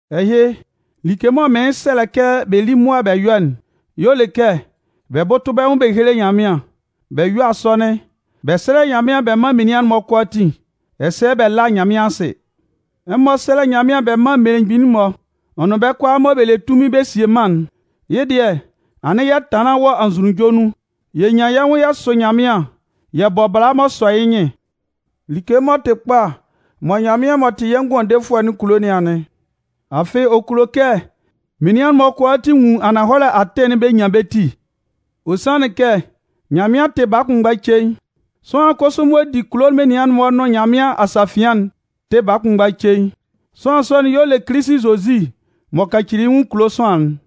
Ɛhɩ, like mɔ mɩɩn sɛlɛ kɛ bɛ lí mʋa bɛ yɔ́'n y'ɔ le kɛ bɛ bʋ́tʋ bɛ́ nwʋn bɛ héle Nyanmɩan, bɛ yɔ́ asɔnɩn, bɛ sɛ́lɛ Nyanmɩan bɛ mán menian'n-mɔ kʋalaatin, ɛsɛ bɛ lá Nyanmɩan asɩ. Ɛmɔ sɛ́lɛ Nyanmɩan bɛ mán mmelemgbin'n-mɔ, ɔ nʋn bɛ́ kʋalaa mɔ bɛ le tunmin bɛ sie mân'n. Yɩ́ dɩɛ, anɩn yɛ tanlan wɔ anzʋnunjɔ nun, yɛ nyan yɛ́ nwʋn yɛ sʋ Nyanmɩan, yɛ bɔ bala m'ɔ sɔ yɩ́ nyɩn. Like m'ɔ tɩ kpa mɔ Nyanmɩan m'ɔ tɩ yɛ́ Ngʋandefʋɛ'n kulo nɩn anɩn. Afɩ ɔ kulo kɛ menian'n-mɔ kʋalaatin nwun ananhɔlɛ atɩn'n bɛ nyan bɛ́ ti. Ɔ sanlɩn kɛ Nyanmɩan tɩ baa kʋnmgba cein. Sʋanlan kʋsʋ m'ɔ di kulo menian'n-mɔ nʋn Nyanmɩan asafian'n tɩ baa kʋnmgba cein. Sʋanlan sɔ'n y'ɔ le Kilisi Zozi m'ɔ kacili yɩ́ nwʋn kulo sʋanlan'n.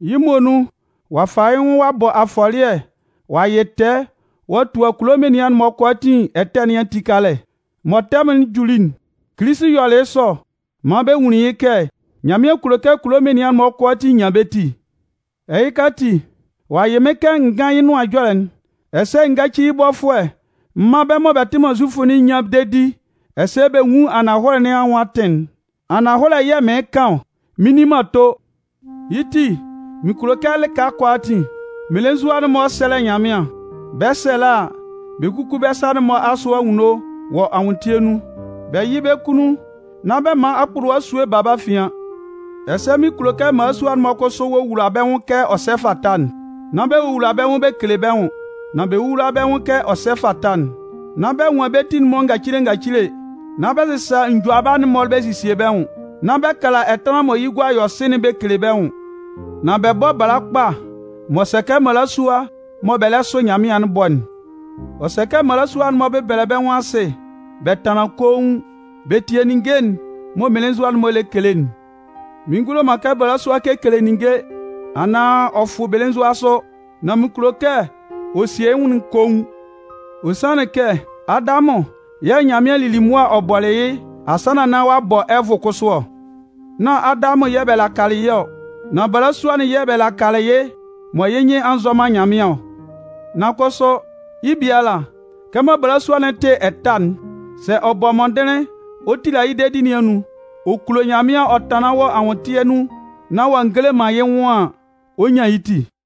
Yɩ́ muonun, ɔ'a fa yɩ́ nwʋn ɔ'a bɔ afɔlɩɛ ɔ'a yɩ tɛɛ ɔ'a tua kulo menian'n-mɔ kʋalaatin ɛtɛ nɩn ati kalɛ. Mɔ tɛmʋn'n juli'n, Kilisi yɔlɩ yɩ́ sɔ maan bɛ nwunlin yɩ́ kɛ Nyanmɩan kulo kɛ kulo menian'n-mɔ kʋalaatin nyan bɛ́ ti. Ɛhɩka ati, ɔ'a yɩ mɩ́n kɛ n gán yɩ́ Nʋan Ɛjɔlɛ'n, ɛsɛ n gáci yɩ́ bɔfʋɛ m mán bɛ́ mɔ bɛ tɩ man Zufʋ'n nyán dedi ɛsɛ bɛ nwún ananhɔlɛ nɩn anwʋn atɩn'n. Ananhɔlɛ yɛ̂ mɩɩn kan ɔ, mɩn nni man ato. Yɩ́ ti, mɩn kulo kɛ lɩka kʋalaatin, mmelenzua'n-mɔ sɛ́lɛ Nyanmɩan. Bɛ 'sɛlɛ a, bɛ kúku bɛ́ sa'n-mɔ asʋ anwunno wɔ anwʋntɩɛ nun, bɛ yɩ́ bɛ́ kunnun, nán bɛ man akpʋlʋwa esue ba bɛ́ afian. Ɛsɛ mɩn kulo kɛ mmalasua'n-mɔ kʋsʋ wowula bɛ́ nwʋn kɛ ɔ sɛ fata'n. Nán bɛ wowula bɛ́ nwʋn bɛ kele bɛ́ nwʋn, nan bɛ wówula bɛ́ nwʋn kɛ ɔ sɛ fata'n. Nán bɛ nwan bɛ́ ti'n-mɔ ngacile ngacile, nán bɛ sɩsa njʋaba'n-mɔ bɛ sesie bɛ́ nwʋn, nán bɛ kala ɛtanlan mɔ yɩ́ gua yɔ sɩ'n bɛ kele bɛ́ nwʋn. Nan bɛ bɔ́ bala kpa m'ɔ sɛ kɛ mmalasua mɔ bɛ lɛ sʋ Nyanmɩan'n bɔ'n. Ɔ sɛ kɛ mmalasua'n-mɔ bɛ́bɛlɛ bɛ́ nwʋn asɩ, bɛ tánlan koun, bɛ tíe ninnge'n mɔ mmelenzua'n-mɔ lɛ kele'n. Mɩn ngulo man kɛ balasua kekele ninnge anaan ɔ fʋ belenzua sʋ. Nan mɩn kulo kɛ ɔ sie yɩ́ nwʋn'n koun. Ɔ sanlɩn kɛ Adamʋn yɛ̂ Nyanmɩan lili mʋa ɔ bɔlɩ yɩ́ asannan nán ɔ'a bɔ Ɛvʋ kʋsʋ ɔ. Nán Adamʋn yɛ̂ bɛ lakalɩ yɩ́ ɔ. Nan balasua'n yɛ̂ bɛ lakalɩ yɩ́ mɔ yɩ́ nyɩn a nzɔ man Nyanmɩan ɔ. Nan kʋsʋ, yɩ́ biala, kɛmɔ balasua'n tɩ ɛta'n, sɛ ɔ bɔ mɔndɩnlɩn ɔ tila yɩ́ dedi nɩn anun, ɔ kulo Nyanmɩan ɔ tanlan wɔ anwʋntɩɛ nun nán ɔ'a ngele man yɩ́ nwʋn an, ɔ 'nyan yɩ́ ti.